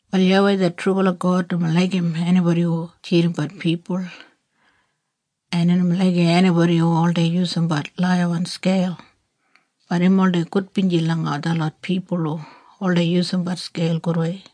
Wal YAWEI det trubala God nomo laigim enibodi hu tjidimbat pipul, en im nomo laigim enibodi hu oldei yusumbat laiyawan skeil, bat im oldei gudbinji langa detlot pipul hu oldei yusumbat skeil gudwei.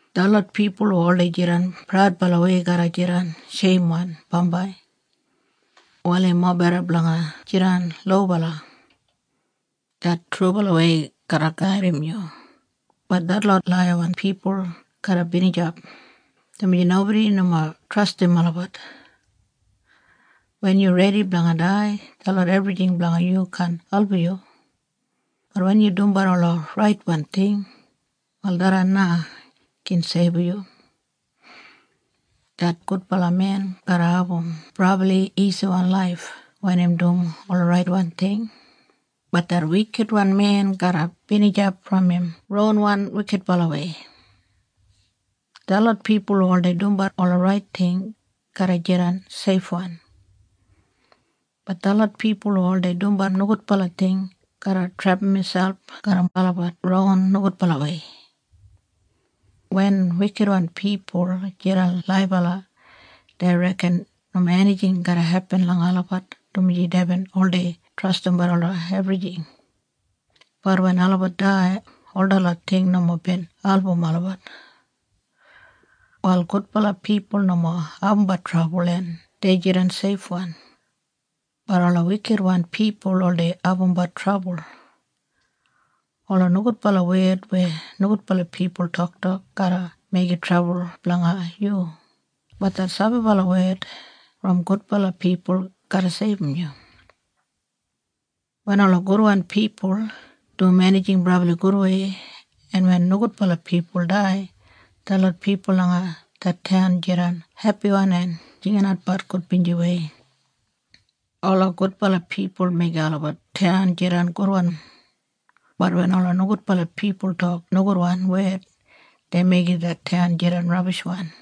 Detlot pipul hu oldei jidan praudbalawei garra jidan sheimwan bambai. Wal im mobeda blanga jidan lobala. Det trubalawei garra gaidim yu, bat detlot laiyawan pipul garra binijap, dumaji nobodi nomo trastim olabat. Wen yu redi blanga dai, detlot ebrijing blanga yu kaan album yu, bat wen yu dumbat ola raitwan ting wal tharran na gin seibum yu. Det gudbala men garra abum brabli isiwan laif wen im dum ola raitwan ting, bat det wikitwan men garra binijap brom im ronwan wikitbalawei. Detlot pipul hu oldei dumbat ola rait ting, garra jidan seifwan, bat detlot pipul hu oldei dumbat nogudbala ting garra trepam miselp garram olabat ron nogudbalawei. Wen wikitwan pipul jidan laibala dei reken nomo enijing garra hepin langa olabat dumaji deibin oldei trastimbat ola ebrijing, bat wen olabat dai, ol detlot ting nomo bin album olabat. Wal gudbala pipul nomo abumbat trabul en dei jidan seifwan, bat ola wikitwan pipul oldei abumbat trabul. Ola nogudbala wed weya nogudbala pipul toktok garra meigim trabul blanga yu, bat det sabibala wed brom gudbala pipul garra seibum yu. Wen ola gudwan pipul dum enijing brabli gudwei, en wen nogudbala pipul dai, detlot pipul langa det taun jidan hepiwan en jinginatbat gudbinjiwei. Ola gudbala pipul meigim olabat taun jidan gudwan, bat wen ola nogudbala pipul tok nogudwan wed dei meigim det taun jidan rabishwan.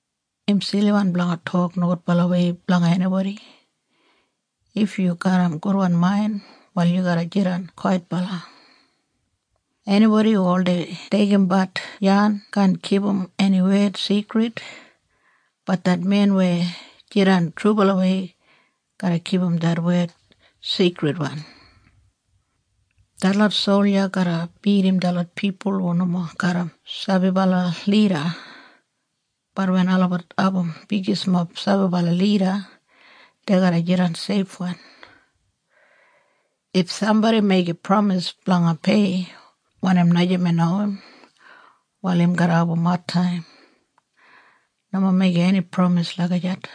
Im siliwan blanga tok nogudbalawei blanga enibodi. If yu garram gudwan main, wal yu garra jidan kwaitbala. Enibodi hu oldei deigimbat yan kaan kipum eni wed sigrid, bat det men weya jidan trubalawei garra kipum det wed sigridwan. Detlot solja garra bidim detlot pipul hu nomo garram sabibala lida, bat wen olabat abum bigismob sabibala lida, dei garra jidan seifwan. If sambodi meigim pramis blanga pei wanim najamen owim, wal im garra abum adtaim. Nomo meigim eni pramis lagijat.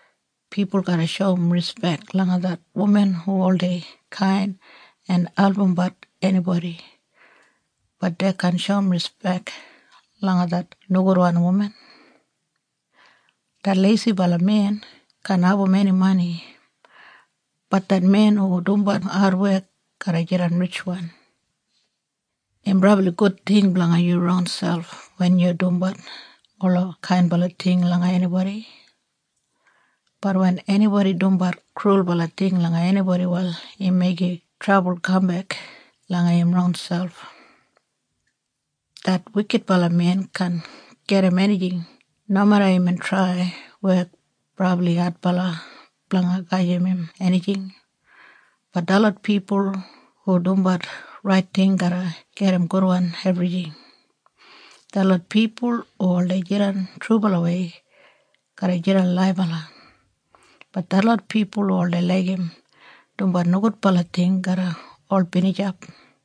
Pipul garra shoum rispek langa det wuman hu oldei kain en albumbat enibodi, bat dei kaan shoum rispek langa det nogudwan wuman. Det leisibala men kaan abum eni mani, bat det men hu dumbat adwek garra jidan ritjwan. Im brabli gud ting blanga yu ronselp wen yu dumbat ola kainbala ting langa enibodi, bat wen enibodi dumbat krulbala ting langa enibodi wal im meigim trabul kambek langa im ronselp. Det wikitbala men kaan gedim enijing nomeda imbin trai wek brabli adbala blanga gajim im enijing, bat detlot pipul hu dumbat rait ting garra gedim gudwan ebrijing. Detlot pipul hu oldei jidan trubalawei garra jidan laibala, bat detlot pipul hu oldei laigim dumbat nogudbala ting garra ol binijap.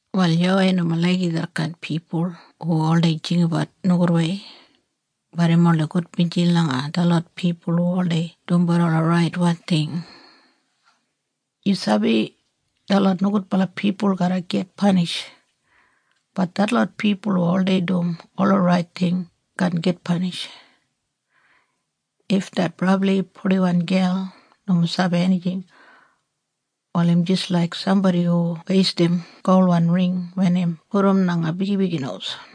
Wal YAWEI nomo laigim detkain pipul hu oldei jinggabat nogudwei, bat im oldei gudbinji langa detlot pipul hu oldei dumbat ola raitwan ting. Yu sabi detlot nogudbala pipul garra git panish, bat detlot pipul hu oldei dum ola rait ting kaan git panish. If det brabli purdiwan gel nomo sabi enijing, wal im jis laik sambodi hu weistim golwan ring wen im pudum langa bigibigi nos.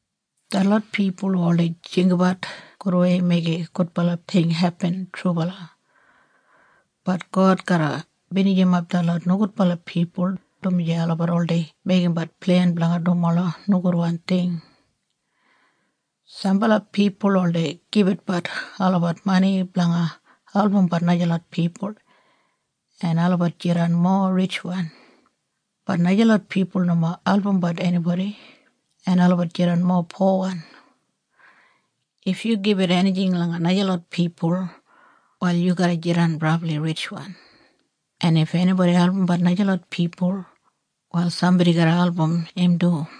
Detlot pipul hu oldei jinggabat gudwei meigim gudbala ting hepin trubala, bat God garra binijimap detlot nogudbala pipul, dumaji olabat oldei meigimbat plen blanga dum ola nogudwan ting. Sambala pipul oldei gibitbat olabat mani blanga albumbat najalot pipul en olabat jidan mowa ritjwan, bat najalot pipul nomo albumbat enibodi en olabat jidan mowa powan. If yu gibit enijing langa najalot pipul wal yu garra jidan brabli ritjwan en if enibodi albumbat najalot pipul wal sambodi garra album im du.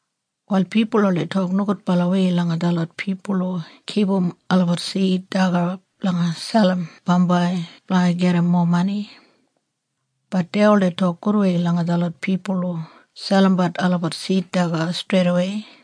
Wal pipul oldei tok nogudbalawei langa detlot pipul hu kipum olabat sid daga blanga selim bambai blanga gedim mowa mani, bat dei oldei tok gudwei langa detlot pipul hu selimbat olabat sid daga streidawei.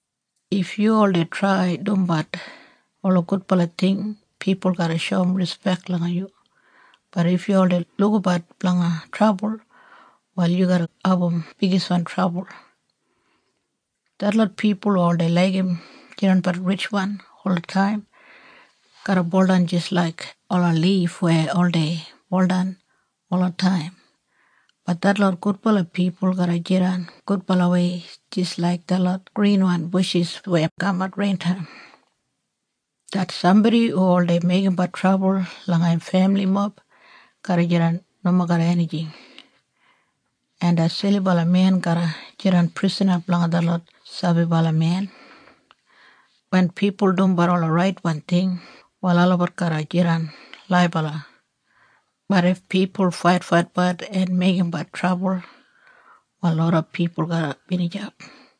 If yu oldei trai dumbat ola gudbala ting pipul garra shoum rispek langa yu, bat if yu oldei lukabat blanga trabul, wal yu garra abum bigiswan trabul. Detlot pipul hu oldei laigim jidanbat ritjwan olataim garra buldan jis laik ola lif weya oldei buldan olataim, bat detlot gudbala pipul garra jidan gudbalawei jis laik detlot grinwan bushis weya kamat rein taim. Det sambodi hu oldei meigimbat trabul langa im femilimob garra jidan nomo garram enijing, en det silibala men garra jidan prisana blanga detlot sabibala men. Wen pipul dumbat ola raitwan ting wal olabat garra jidan laibala, bat if pipul faitfaitbat en meigimbat trabul wal loda pipul garra binijap.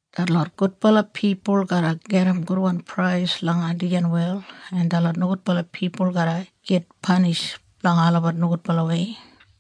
Detlot gudbala pipul garra gedim gudwan prais langa dijan wel, en detlot nogudbala pipul garra git panish blanga olabat nogudbalawei.